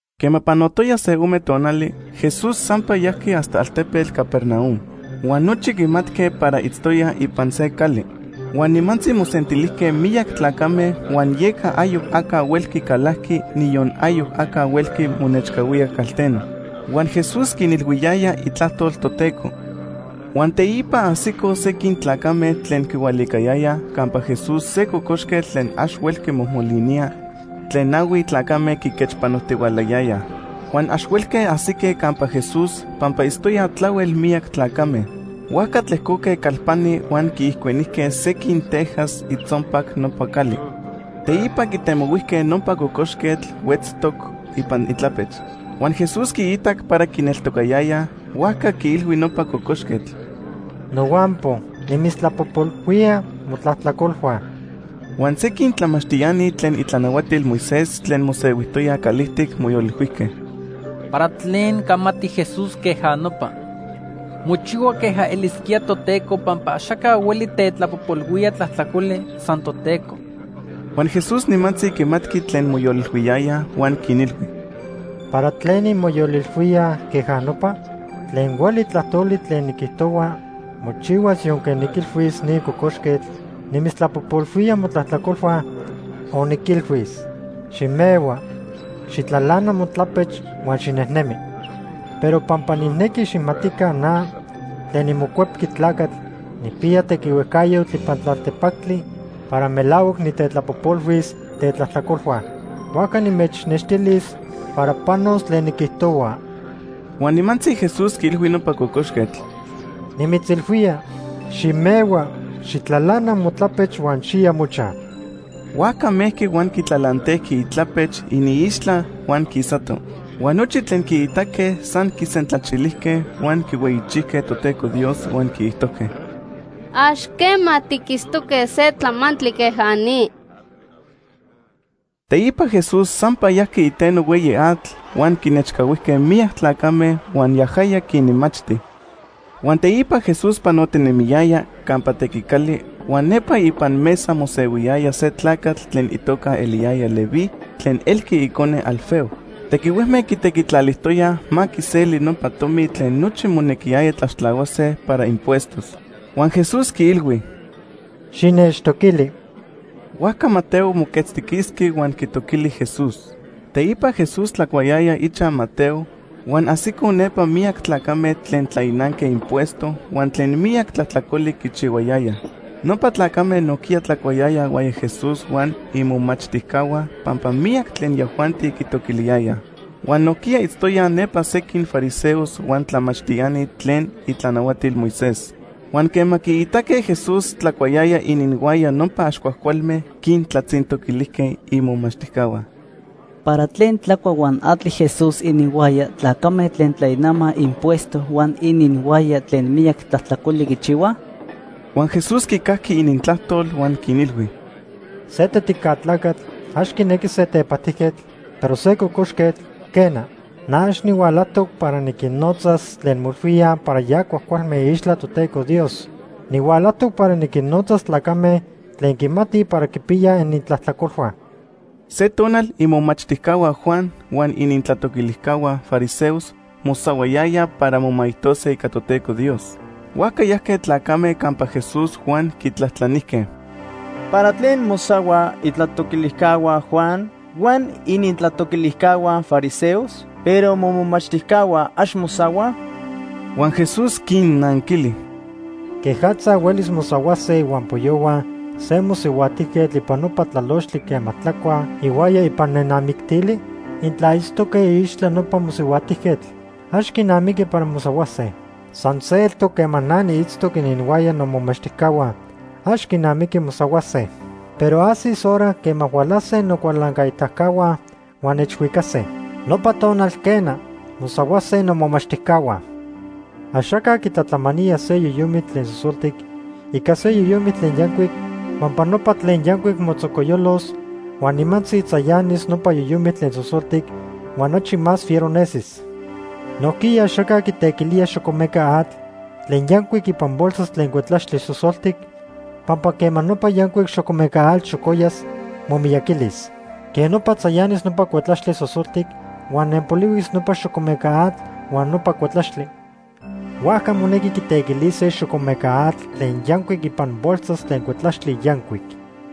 Quema panotoya se ome tonali, Jesús sampa yajqui hasta altepetl Capernaum, huan nochi quimatque para itztoya ipan se cali. Huan nimantzi mosentilijque miyac tlacame huan yeca ayoc aca huelqui calaqui, niyon ayoc aca huelqui monechcahuía calteno. Huan Jesús quinilhuiyaya itlajtol Toteco. Huan teipa ajsicoj sequin tlacame tlen quihualicayayaj campa Jesús se cocoxquetl tlen ax huelqui mojmolinía tlen nahui tlacame quiquechpanojtihualayayaj. Huan ax huelque ajsique campa Jesús pampa itztoyaj tlahuel miyac tlacame, huajca tlejcoque calpani huan quiijcuenijque sequin tejas itzonpac nopa cali. Teipa quitemohuijque nopa cocoxquetl huetztoc ipan itlapech. Huan Jesús quiitac para quineltocayayaj, huajca quiilhui nopa cocoxquetl: ―Nohuampo nimitztlapojpolhuía motlajtlacolhua. Huan sequin tlamachtiani tlen itlanahuatil Moisés tlen mosehuijtoyaj calijtic moyolilhuijque: “¿Para tlen camati Jesús queja nopa? Mochihua queja elisquía Toteco pampa axaca hueli tetlapojpolhuía tlajtlacoli, san Toteco.” Huan Jesús nimantzi quimatqui tlen moyolilhuiyayaj huan quinilhui: ―¿Para tlen inmoyolilhuíaj queja nopa? Tlen hueli tlajtoli tlen niquijtohua mochihuas yonque niquilhuis ni cocoxquetl: ‘Nimitztlapojpolhuía motlajtlacolhua’, o niquilhuis: ‘Ximehua, xijtlalana motlapech huan xinejnemi.’ Pero pampa nijnequi xijmatica na, tlen niMocuepqui Tlacatl, nijpiya tequihuejcayotl ipan tlaltepactli para melahuac nitetlapojpolhuis tetlajtlacolhua, huajca nimechnextilis para panos tlen niquijtohua. Huan nimantzi Jesús quiilhui nopa cocoxquetl: ―Nimitzilhuía, ximehua, xijtlalana motlapech huan xiya mochaj. Huajca mejqui huan quitlalantejqui itlapech iniixtla huan quisato. Huan nochi tlen quiitaque san quisentlachilijque huan quihueyichijque Toteco Dios huan quiijtojque: ―Ax quema tiquitztoque se tlamantli queja ni. Teipa Jesús sampa yajqui iteno hueyi atl, huan quinechcahuijque miyac tlacame huan yajaya quinmachti. Huan teipa Jesús panotinemiyaya campa tequicali, huan nepa ipan mesa mosehuiyaya se tlacatl tlen itoca eliyaya Leví tlen elqui icone Alfeo. Tequihuejme quitequitlalijtoyaj ma quiseli nopa tomi tlen nochi monequiyaya tlaxtlahuase para impuestos. Huan Jesús quiilhui: ―Xinechtoquili. Huajca Mateo moquetztiquisqui huan quitoquili Jesús. Teipa Jesús tlacuayaya ichaj Mateo huan ajsicoj nepa miyac tlacame tlen tlainanque impuesto huan tlen miyac tlajtlacoli quichihuayayaj. Nopa tlacame nojquiya tlacuayayaj ihuaya Jesús huan imomachtijcahua pampa miyac tlen yajuanti quitoquiliyayaj. Huan nojquiya itztoyaj nepa sequin fariseos huan tlamachtiani tlen itlanahuatil Moisés. Huan quema quiitaque Jesús tlacuayaya ininhuaya nopa ax cuajcualme, quintlatzintoquilijque imomachtijcahua: ―¿Para tlen tlacua huan atli Jesús ininhuaya tlacame tlen tlainamaj impuesto huan ininhuaya tlen miyac tlajtlacoli quichihuaj? Huan Jesús quicajqui inintlajtol huan quinilhui: ―Se tetica tlacatl ax quinequi se tepajtijquetl, pero se cocoxquetl, quena. Na ax nihualajtoc para niquinnotzas tlen moilhuíaj para ya cuajcualme iixtla Toteco Dios. Nihualajtoc para niquinnotzas tlacame tlen quimatij para quipiyaj inintlajtlacolhua. Se tonal imomachtijcahua Juan huan inintlatoquilijcahua fariseos mosahuayayaj para momaijtose ica Toteco Dios. Huajca yajque tlacame campa Jesús huan quitlajtlanijque: ―¿Para tlen mosahuaj itlatoquilijcahua Juan huan inintlatoquilijcahua fariseos, pero momomachtijcahua ax mosahuaj? Huan Jesús quinnanquili: ―¿Quejatza huelis mosahuase ihuampoyohua se mosihuajtijquetl ipan nopa tlalochtli quema tlacuaj ihuaya ipan nenamictili? Intla itztoque iixtla nopa mosihuajtijquetl, ax quinamiqui para mosahuase. San se eltoc quema na niitztoc ininhuaya nomomachtijcahua, ax quinamiqui mosahuase. Pero ajsis hora quema hualase nocualancaitacahua huan nechhuicase. Nopa tonal, quena, mosahuase nomomachtijcahua. Axaca quitlatlamanía se yoyomitl tlen sosoltic ica se yoyomitl tlen yancuic pampa nopa tlen yancuic motzocoyolos huan nimantzi tzayanis nopa yoyomitl tlen sosoltic huan achi más fiero nesis. Nojquiya axaca quitequilía xocomeca atl tlen yancuic ipan bolsas tlen cuetlaxtli sosoltic, pampa quema nopa yancuic xocomeca atl xocoyas, momiyaquilis. Quej nopa tzayanis nopa cuetlaxtli sosoltic huan nenpolihuis nopa xocomeca atl huan nopa cuetlaxtli. Huajca monequi quitequilise xocomeca atl tlen yancuic ipan bolsas tlen cuetlaxtli yancuic.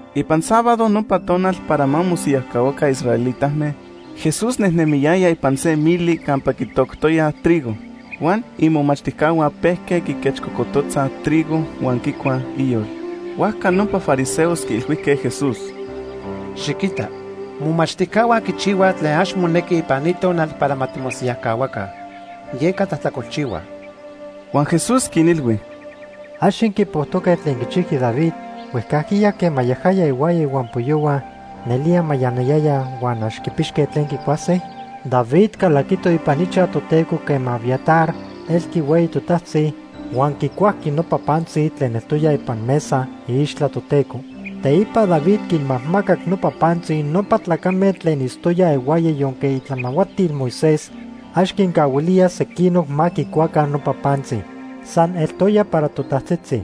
Ipan sábado, nopa tonal para ma mosiyajcahuaca israelitame, Jesús nejnemiyaya ipan se mili campa quitoctoyaj trigo, huan imomachtijcahua pejque quiquechcocototzaj trigo huan quicuaj iyol. Huajca nopa fariseos quiilhuijque Jesús: ―Xiquita, momachtijcahua quichihuaj tlen ax monequi ipan ni tonal para ma timosiyajcahuaca, yeca tlajtlacolchihuaj. Huan Jesús quinilhui: ―¿Ax inquipojtoque tlen quichijqui David huejcajquiya quema yajaya ihuaya ihuampoyohua nelía mayanayayaj huan ax quipixque tlen quicuase? David calaquito ipan ichaj Toteco quema Abiatar elqui hueyi totajtzi, huan quicuajqui nopa pantzi tlen eltoya ipan mesa iixtla Toteco. Teipa David quinmajmacac nopa pantzi nopa tlacame tlen itztoyaj ihuaya yonque itlanahuatil Moisés ax quincahuilía sequinoc ma quicuaca nopa pantzi. San eltoya para totajtzitzi.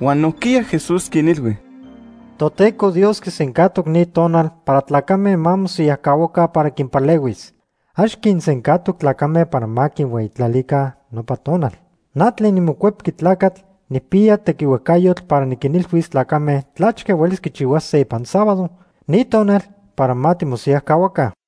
Huan nojquiya Jesús quinilhui: ―Toteco Dios quisencajtoc ni tonal para tlacame ma mosiyajcahuaca para quinpalehuis. Ax quinsencajtoc tlacame para ma quihueyitlalica nopa tonal. Na tlen niMocuepqui Tlacatl, nijpiya tequihuejcayotl para niquinilhuis tlacame tlachque huelis quichihuase ipan sábado, ni tonal para ma timosiyajcahuaca.